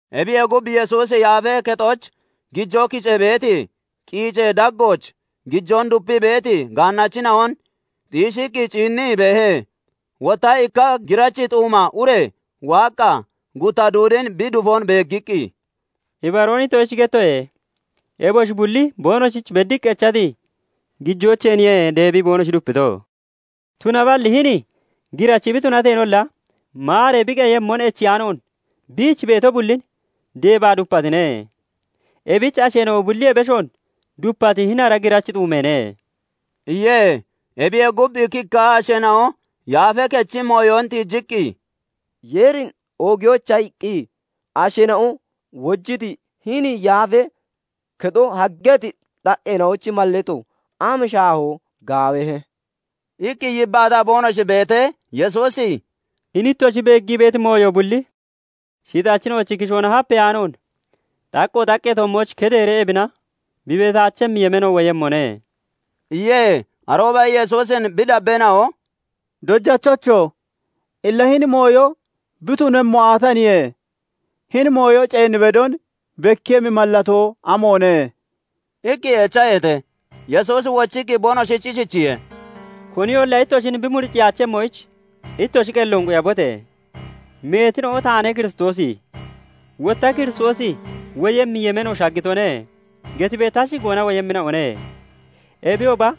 Ebiyee gub, Yesuusi Yaafee Kexooch gijoo kicee beeti qiicee daggooch gijoon dupii beeti gaannachina'on xiishiqqi ciinnii beehe. Wotta ikka girachi xuuma ure waaqqa gutta duudin bi dufon beeggiqqi, "Ibaroon ittoshich gettoye; eboshi bulli boonoshich beddiqqi echati gijoocheeniye deebii boonoshi dupito; tunaballi hini girachi bi tunateenolla maaree bi qeyemmon echiyaanoon biich beeti bullinoo deebaa dupatine. Ebich asheena'o bulliyee beshoon dupati hini girachi xuumeene" iye. Ebiyee gub, ikkikka asheena'o Yaafee Kechi mooyon tiijiqqi, "Yeerin oogiyoyicha iqqi asheena'o wojiti, hini Yaafee Kexo haggeeti xaqqeena'ochi mallato am shaahoo gaawahe!" iqqi yibbaataa boonoshi beetee, Yesuusi "Hini ittoshi beeggii beeti mooyo bulli shixachina'ochi kishoona hapeyaanoon xaqqo xaqqee toommooch kedeeree ebina bi beetaachemmi yemeeno woyemmone" iye. Arooba Yesuusin bi dabbeena'o "Dojachocho! Illa hini mooyo bi tunemmo aataniye? Hini mooyo ceen bedon bekkiiyemmi mallatoo amoone?" iqqi echaheete. Yesuusi wochiqqi boonoshich ishichiye:- "Koniyolla ittoshin bi muriciyaachemmoyich ittoshi qelloon quyabote! Meetina'o 'Taane Kiristoosi' wotta 'Kiristoosi woyemmi yemeeno shaggitone' getibee ta shigoona woyemmina'one; ebiyooba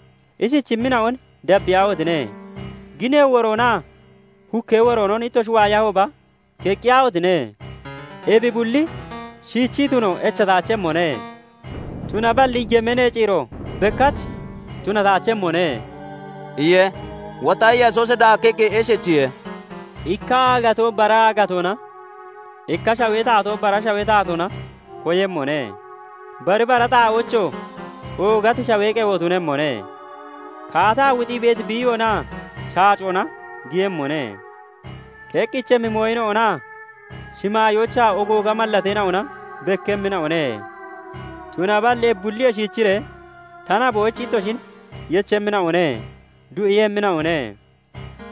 ishichimmina'on dabbiyaahotine! Ginee woroonaa hukkee woroonon ittoshi waayahooba keqqiyaahotine! Ebi bulli shiichii tuno echataachemmone; tunaballi yemeenee ciiro bekkach tunataachemmone" iye. Wotta Yesuusi daakkiqqi ishichiye:- "Ikka aagatoo bara aagatoona, ikka shawee taatoo bara shawee taatoona koyemmone. Bari bara xaa'oochoo oogati shawee qewo tunemmone; kaataa wuxii beeti biiyoonaa shaacoona giyemmone; keqqichemmi mooyina'onaa shimaayoochaa ogooga mallateena'ona bekkemmina'one. "Tunaballi ebi bulliyee shiichiree, ta naboyich ittoshin yechemmina'one; duu'iiyemmina'one;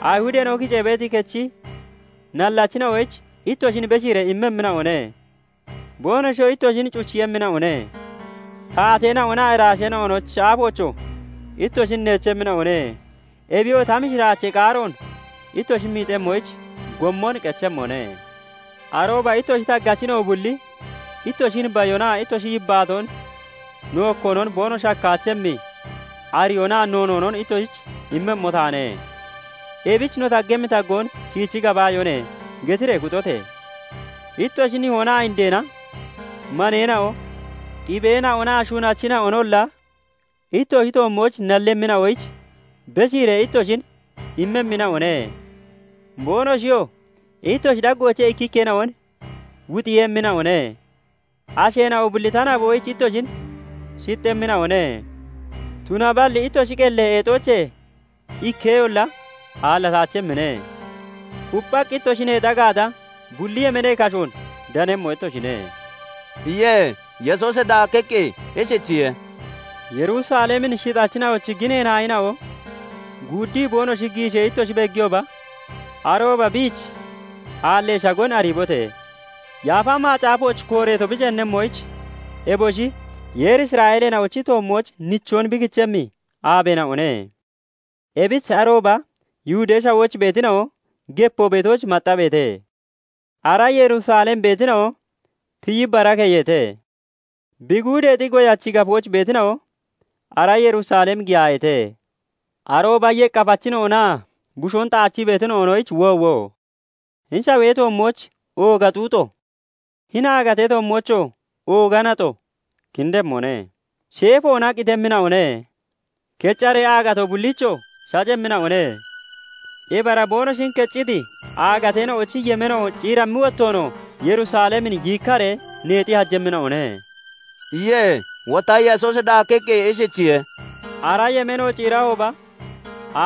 Ayihudeena'o kicee beeti kechi nallachina'oyich ittoshin beshiiree immemmina'one; boonoshiyoo ittoshin cuchiiyemmina'one; taateena'onaa iraasheena'onochi aafoochoo ittoshin neechemmina'one; Ebiyoo ta mishiraachee qaaroon ittoshi miixemmoyich gommon qechemmone. Arooba ittoshi taggachina'o bulli ittoshin bayonaa ittoshi yibbaatoon nookkoonon boonoshi hakkaachemmi ariyoonaa noonoonon ittoshich immemmo taane. Ebich 'No taggemmi taggoon shiichi gabaayone!' getiree kuxote! Ittoshi nihoonaa indeena, maneena'oo, xibeena'onaa shunachina'onolla ittoshi toommooch nallemmina'oyich beshiiree ittoshin immemmina'one; boonoshiyoo ittoshi daggoochee ikkikkeena'on wuxiiyemmina'one. Asheena'o bulli ta naboyich ittoshin shixxemmina'one. Tunaballi ittoshi qelli eexoochee ikkeyolla aallataachemmine; kupphaqqi ittoshi neexa gaata, bulli yemeenee kashoon danemmo ittoshine" iye. Yesuusi daakkiqqi ishichiye:- "Yerusalemin shixachina'ochi ginee naayina'o guuddii boonoshi giishee ittoshi beegiyooba, arooba biich aallee shagon ariibote! Yaafa Macaafooch kooreeto bi ceennemmoyich eboshi Yeeri Isra'eeleena'ochi toommooch nichoon bi kichemmi aabeena'one. Ebich arooba Yihudee Shawooch beetina'o gepoo beetooch maxxabeete! Ara Yerusalem beetina'o tiyi bara keyeete! Bi guudeexi goyachi gafooch beetina'o ara Yerusalem giyaayeete! Arooba yeqqafachina'onaa bushoon xaachii beetina'onoyich woowo! Hini shawee toommooch ooga xuuxo, hini aagatee toommoochoo ooga naxo kindemmone. Sheefoona qitemmina'one; keccaree aagatoo bulliichoo shacemmina'one; ebi ara boonoshin kecciti aagateena'ochi yemeeno ciirammi wottoonoo Yerusalemin yiikkaree neexi hajemmina'one" iye. Wotta Yesuusi daakkiqqi ishichiye:- "Ara yemeeno ciirahooba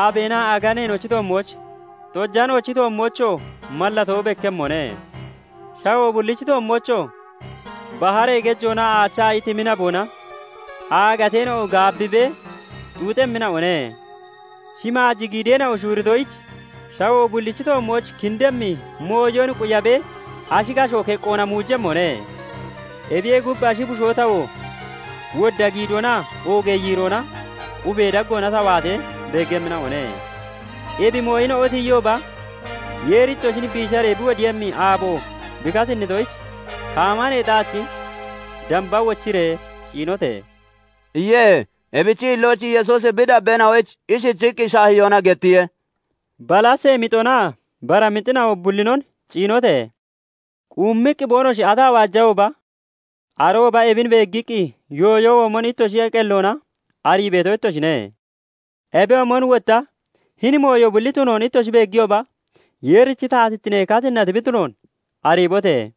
aabeenaa aganeenochi toommooch, xojanoochi toommoochoo mallatoo bekkemmone. Shawoo bullichi toommoochoo baharee gejoonaa aachi aayi timi naboona aagateena'o gaabbibee xuuxemmina'one. Shimaaji giideena'o shuuritoyich, shawoo bullichi toommooch kindemmi mooyon quyabee ashi kashoo keqqoona muujemmone. Ebiyee gub, ashi bushoo tawoo wodda giidoonaa oogee yiiroona 'Qubee daggoona ta waatee' beeggemmina'one. Ebi mooyina'o tiyiyooba, Yeeri ittoshin biisharee bi wodiiyemmi aabo bi katinnitoyich, kaama neexaachi damba wochiree ciinote!" iye. Ebichi hillooch Yesuusi bi dabbeena'oyich ishichiqqi shaahiyoona gettiye:- "Balasee mixonaa bara mixina'o bullinon ciinote! Quummiqqi boonoshi ataa waajahooba, arooba ebin beeggiqqi yooyo womon ittoshi qelloona arii beeto ittoshine. Ebiyoomon wotta hini mooyo bulli tunoon ittoshi beegiyooba, Yeerichi taatittine katinnati bi tunoon ariibote!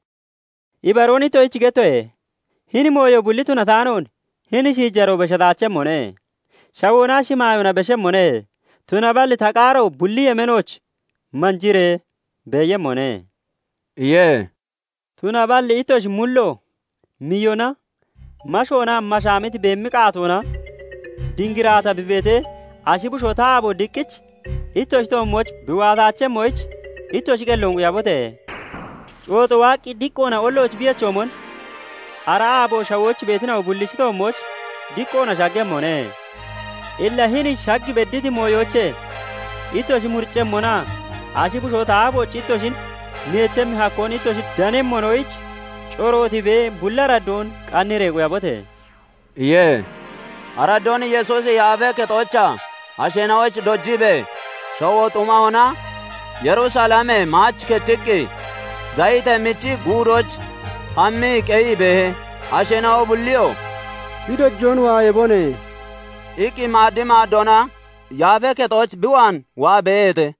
"Ibaroon ittoshich gettoye; hini mooyo bulli tunataanoon hini shiijaroo beshataachemmone. shawoonaa shimaayoona beshemmone; tunaballi ta qaaro bulli yemeenooch manjiree beeyemmone" iye. "Tunaballi ittoshi mullo miyona, mashoonaa mashaamiti beemi qaatoona dingiraata bi beetee, ashi bushoo ta aabo diqqich ittoshi toommooch bi waataachemmoyich, ittoshi qelloon quyabote! Cooxo waaqqi diqqoona ollooch bi yechoomon, ara aabo shawooch beetina'o bullichi toommooch diqqoona shaggemmone. Illa hini shag bedditi mooyoochee ittoshi muriccemmonaa ashi bushoo ta aafooch ittoshin neechemmi hakkoon ittoshi danemmonoyich corootibee, bulli araddoon qanniree quyabote!" iye. Araddoon Yesuusi Yaafee Kexoochaa asheena'oyich dojiibee, shawoo xumahona Yerusalemee maach kechiqqi, Zayitee michi Guudooch hammii qeyii beehe. Asheena'o bulliyoo "Bi dojoon waayabone" iqqi maad maaddoona Yaafee Kexooch bi waan waa beeheete.